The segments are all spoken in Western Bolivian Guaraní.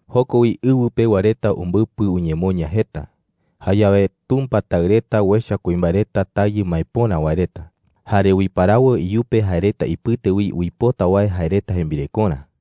Joko wi ɨwɨ pewa reta umbɨpɨ uñemoña jeta. Jayawe Tumpa taɨ reta uecha kuimbae reta tayɨ maepöra wae reta, jare uiparawo iyupe jae reta ipɨte wi uipota wae jae reta jembirekorä.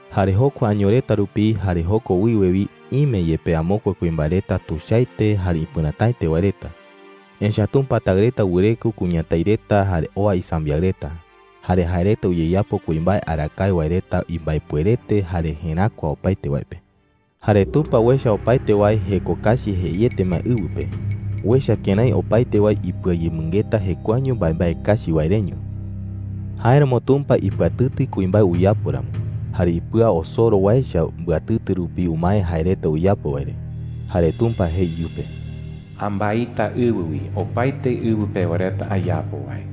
Jare jokua año reta rupi, jare joko wiwe wi, ime yepe amokue kuimbae reta tuichaete jare ipɨrätaete wae reta. Echa’ä Tumpa taɨ reta wɨreko kuñatái reta jare oa isambiaɨ reta. Jare jae reta uyeyapo kuimbae arakae wae reta imbaepuerete jare jeräkua opaete wae pe. Jare Tumpa uecha opaete wae jeko kachi jeiete ma ɨwɨ pe. Uecha kërái opaete wae ipɨayemɨngeta jekuaeño mbaembae kachi wae reño. Jáeramo Tumpa ipɨatɨtɨ kuimbae uyapo ramo, jare ipɨa osoro wae echa mbɨatɨtɨ rupi umae jae reta uyapo wae re. Jare Tumpa jei iyupe: “Ambaita ɨwɨ wi opaete ɨwɨ pewa reta ayapo wae.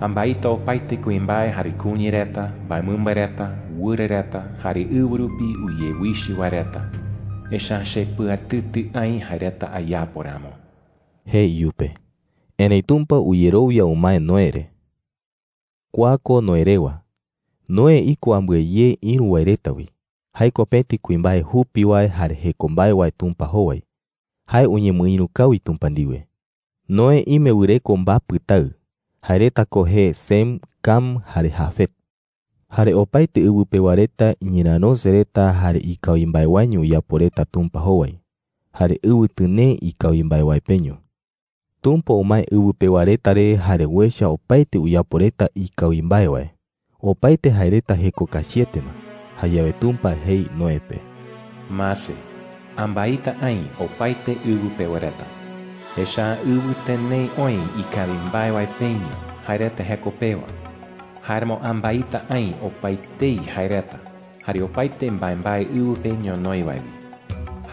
Ambaita opaete kuimbae jare kuña reta, mbaemɨmba reta, wɨra reta, jare ɨwɨ rupi uyewichɨ wae reta. Echa’ä chepɨatɨtɨ aï jae reta ayapo ramo,” jei iyupe. Erëi Tumpa uyerowia umae Noé re. Kua ko Noé rewa: Noé iko ambɨe ye ïru wae reta wi. Jae ko pëti kuimbae jupi wae jare jeko mbae wae Tumpa jowai. Jae uñemɨïru kawi Tumpa ndiwe. Noé ime wɨreko mbapɨ taɨ. Jae reta ko jee Sem, Cam, jare Jafet. Jare opaete ɨwɨ pewa reta iñerärose reta jare ikawi mbae waeño uyapo reta Tumpa jowai. Jare ɨwɨ tɨnee ikawi mbae wae peño. Tumpa umae ɨwɨ pewa reta re jare uecha opaete uyapo reta ikawi mbae wae. Opaete jae reta jeko kachiete ma. Jayawe Tumpa jei Noé pe: “¡Mase! Ambaita aï opaete ɨwɨ pewa reta,” jei. “Echa’ä ɨwɨ tɨnee oï ikawi mbae wae peño jae reta jeko pewa. Jáeramo ambaita aï opaetei jae reta jare opaete mbaembae ɨwɨ pe ñonoï wae wi,” jei chupe.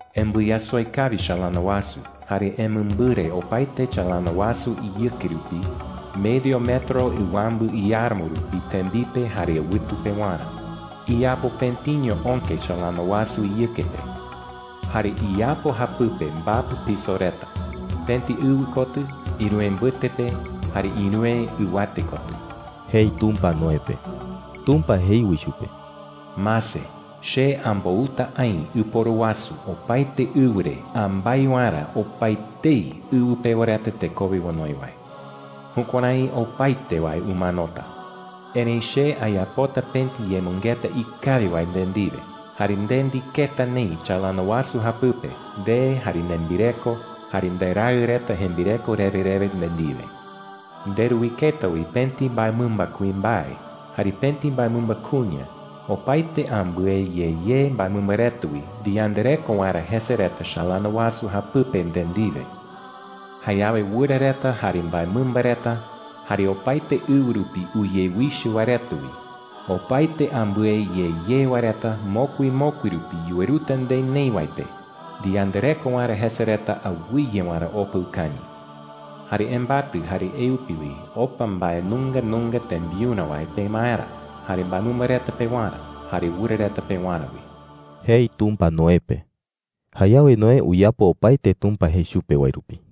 Embɨyasoi kawi chalana wasu, jare emɨmbɨre opaete chalana wasu iyɨke rupi medio metro ɨwambɨ iáramo rupi tembipe jare ɨwɨtu pewarä. Iyapo pëtiño öke chalana wasu iyɨke pe. Jare iyapo japɨpe mbapɨ piso reta: pëti ɨwɨ kotɨ, ïruwe mbɨte pe, jare ïruwe ɨwate kotɨ,” jei Tumpa Noé pe. Tumpa jei wi chupe: “¡Mase! Che ambouta aï ɨporu wasu opaete ɨwɨ re ambái waerä opaetei ɨwɨ pewa reta tekowe onoi wae,” jei. “Jukuärái opaete wae umanota,” jei. “Erëi che ayapota pëti yemɨngeta ikawi wae nde ndiwe. Jare nde ndiketa neï chalana wasu japɨpe – nde, jare nembireko, jare nderaɨ reta jembireko rewe rewe nde ndiwe,” jei Tumpa chupe. “Nderuiketa wi pëti mbaemɨmba kuimbae jare pëti mbaemɨmba kuña opaete ambɨe ye ye mbaemɨmba reta wi ndiyandareko waerä jese reta chalana wasu japɨpe nde ndiwe,” jei. “Jayawe wɨra reta, jare mbaemɨmba reta, jare opaete ɨwɨ rupi uyewichɨ wae reta wi, opaete ambɨe ye ye wae reta mokui mokui rupi yuweruta nde neï wae pe ndiyandareko waerä jese reta awɨye waerä opa ukañɨ,” jei. “Jare embatɨ eupi opa mbae nunga nunga tembiurä wae pemaerä, jare mbaemɨmba reta pewarä, jare wɨra reta pewarä wi,” jei Tumpa Noé pe. Jayawe Noé uyapo opaete Tumpa jei chupe wae rupi.